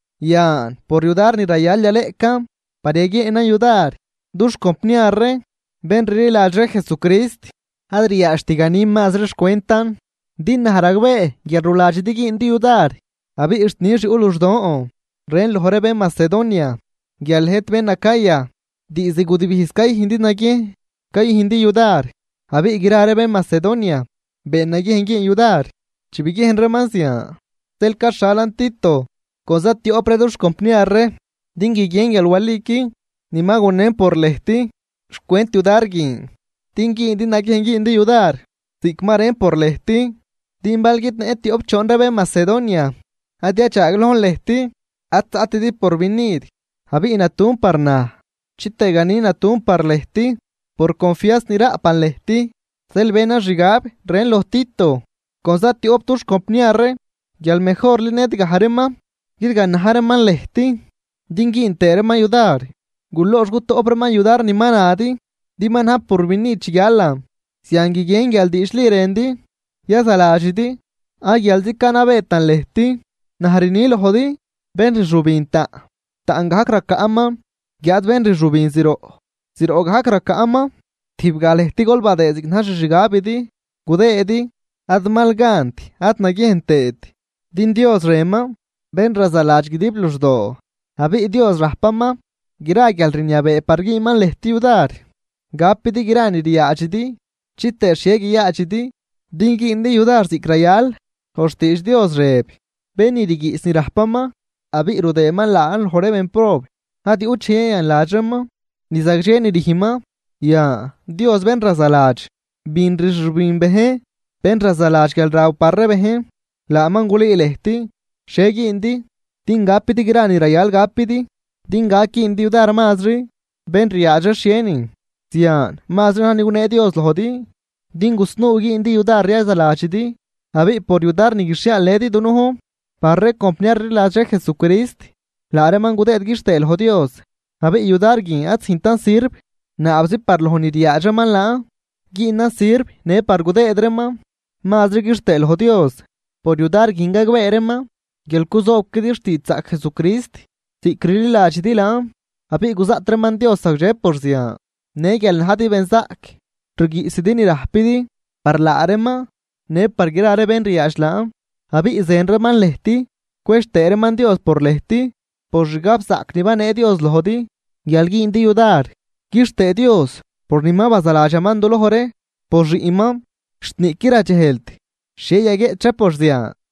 Yan por yudar ni rayal yaleꞌcan par yaguieenan yudar dux compniar ree bén rliladx ree Jesucrist, ad ryaadxt ganin mazri xcwentan, din naj ragbee guial ruladxidi güündi yudar. Abiꞌ xt nix yuꞌ luxdon rën loj ree bén Macedonia guial lëjt bén Acaya diizd gudibijz cayüjndi naguiejn cayüjndi yudar, abiꞌ gra ree bén Macedonia been naguiejn güün yudar chi biguiejn reeman zian. Zeel caxhalan Tito con za tioꞌp ree dux compniar ree din guiguien guial waliqui ni ma gunen por lëjt xcwent yudar guin, din güündi naguiejn güündi yudar ziꞌc ma rën por lëjt. Din bal guidnëꞌn tioꞌp choon ree bén Macedonia ad yadxaaglojn lëjt ad zaꞌtidi porvinid, abiꞌ natun par naj chitëë ganin natun par lëjt por confianz ni raꞌpan lëjt. Zeel benan xgab rën loj Tito con za tioꞌp dux compniar ree guial mejorli ned gaj reeman guidganaj reeman lëjt, din güün tëë reeman yudar guloox gutoꞌp reeman yudar ni ma nadi din ma najn purvinid chi guialan. Zian guiguien guial diidxli rëndi yazaladxidi ad guialzi canabeetan lëjt. Naj rni lojdi bén rxübin taꞌn, taꞌn gajc racaꞌman, guiáad bén rxübin zroꞌ, zroꞌ gajc racaꞌman. Tijbgaj lëjt gol badëë ziꞌc na̱j xixgabidi gudëëdi, ad mal gant ad naguiejn tëët, din Dios rënman bén razaladx guidib luxdoo. Abiꞌ Dios rajpaman gra guialrniabee par güünman lëjt yudar gapidi gra ni ryaadxidi chitëë xhie guiyaadxidi din güündi yudar ziꞌc rayal. Loj xtiidx Dios rëb: Bén ni rguiꞌs ni rajpaman abiꞌ rudëëman laan loj ree bénprob, ad yuꞌt dxej yayanladx reeman ni zagdxe ni rüjnman. Yan Dios bén razaladx bin rxübin bejn, bén razaladx guialraw par ree bejn, laaman gulüü lëjt xhie güündi din gapidi gra ni rayal gapidi, din gac güündi yudar mazri bén ryaadx ree xhienin. Zian mazri na̱j ni gunee Dios lojdi din gusnuu güündi yudar yazaladxidi. Abiꞌ por yudar ni guixhiaalnëdi dunujn par ree compniar rliladx ree Jesucrist, laa reeman gudëëd quixtëë loj Dios. Abiꞌ yudar guin ad züjntan sirv naabzi par loj ni ryaadx reeman laan, güünan sirv në par gudëëd reeman mazri quixtëë loj Dios. Por yudar guin gagbee reeman guial cuzoobquidi xtiidxzaꞌc Jesucrist ziꞌc rliladxidi laan abiꞌ guzaꞌt reeman Dios zagdxe por zian, në guial najdi benzaꞌc rguiꞌsidi ni rajpidi par laa reeman në par gra ree bén ryaadx laan. Abiꞌ zën reeman lëjt, cwedx tëë reeman Dios por lëjt por xgab zaꞌc ni banee Dios lojdi guial güündi yudar. ¡Quixtëë Dios por ni ma bazaladxaman duloj ree por xiꞌnman, xt niꞌquid radxejlt xhie yaguieꞌch ree por zian!